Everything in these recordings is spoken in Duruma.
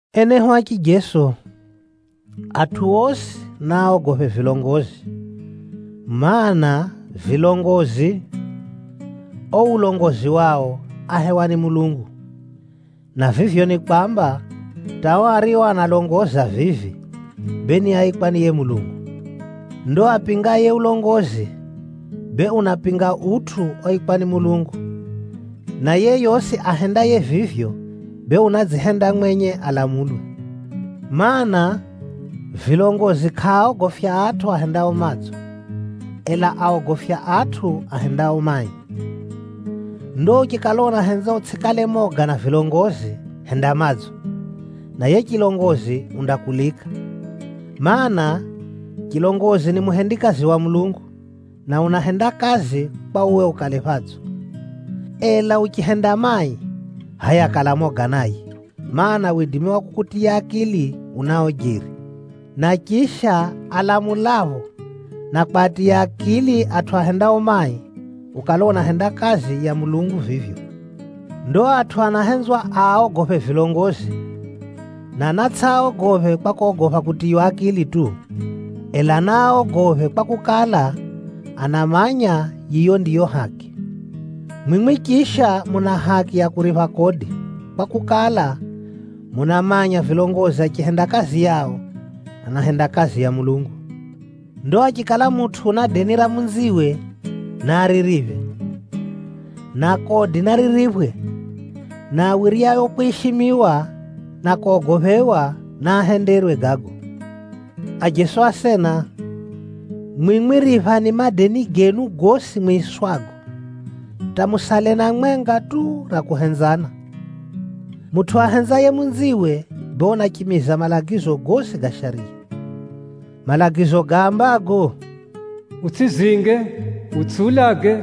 Enehu a chijeso, atʼu osi naaogophe vilongozi, mana, vilongozi, o ulongozi wao áhewa ni Mulungu, na vivyo ni kwamba, hata o ario analongoza vivi, bee ni áikwa ni yiye Mulungu. Ndo apingaye ulongozi, bee unapinga utʼu oikwa ni Mulungu, na yeyosi ahendaye vivyo, bee unadzihenda mwenye alamulwe. Maana, vilongozi kʼaaogofya atʼu ahendao madzo, ela aogofya atʼu ahendao mai. Ndo uchikala unahenza utsʼikale moga na vilongozi, henda madzo, na yiye chilongozi undakulika. Maana, chilongozi ni muhendikazi wa Mulungu, na unahenda kazi kwa uwe ukale phadzo. Ela uchihenda mai, hʼaya kala moga naye, mana, widimi wa kukutiya akili unao jeri. Na chisha, alamulapho na kwatiya akili atʼu ahendao mai, ukala unahenda kazi ya Mulungu vivyo. Ndo atʼu anahenzwa aaogophe vilongozi, na naatsʼiaogophe kwa kogopha kutiywa akili tu. Ela naaogophe kwakukala, anamanya yiyo ndiyo haki. Mwimwi chisha muna haki ya kuripha kodi, kwakukala, munamanya vilongozi achihenda kazi yao, anahenda kazi ya Mulungu. Ndo achikala mutʼu una deni ra munziwe, naaririphe. Na kodi naririphwe, na awiryao kwishimiwa na kogophewa, naahenderwe gago. Ajeso asena, mwimwi riphani madeni genu gosi mwiswago, hata musale na mwenga tu ra kuhenzana. Mutʼu ahenzaye munziwe, bee unachimiza malagizo gosi ga Shariya. Malagizo gaambago, “Utsʼizinge, utsʼiulage,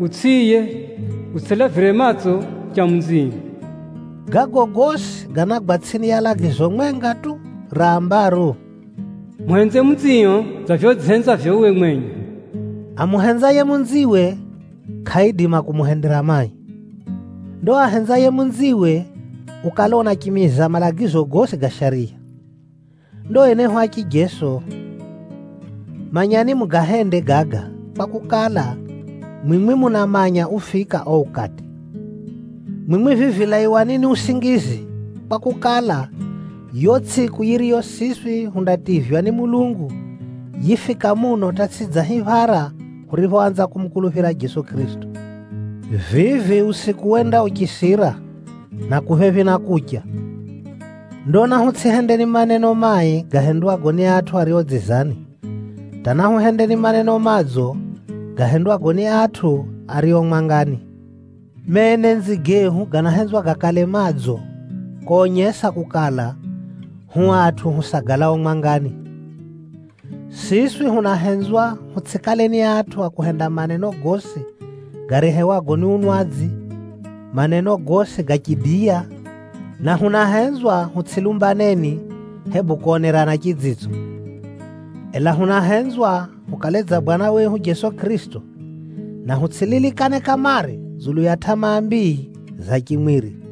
utsʼiiye, utsʼitamani cha munzio,” gago gosi ganagwa tsʼini ya lagizo mwenga tu rambaro, “Muhenze jiranio dza vivyo udzihenzavyo uwe mwenye.” Amuhenzaye munziwe, kʼaidima kumuhendera mai. Ndo ahenzaye munziwe, ukala unachimiza malagizo gosi ga Shariya. Ndo enehu a chijeso, manyani mugahende gaga, kwakukala, mwimwi munamanya ufika o ukati. Mwimwi vivi laiwani ni usingizi, kwakukala, yo tsʼiku yiriyo siswi hundativywa ni Mulungu, yifika muno hata tsʼi dza hiphara huriphoanza kumukuluphira Jeso Kʼirisito. Vivi usiku wenda uchisira, na ku phephi na kucha. Ndo nahutsʼihendeni maneno mai gahendwago ni atʼu ario dzizani, hata nahuhendeni maneno madzo gahendwago ni atʼu ario mwangani. Menenzi gehu ganahenzwa gakale madzo konyesa kukala, hu atʼu husagalao mwangani. Siswi hunahenzwa hutsʼikaleni atʼu a kuhenda maneno gosi garehewago ni unwadzi, maneno gosi ga chidiya, na hunahenzwa hutsʼilumbaneni, hebu konerana chidzitso. Ela hunahenzwa hukale dza Bwana wehu Jeso Kʼirisito, na hutsʼililikane kamare dzulu ya tʼamaa mbii za chimwiri.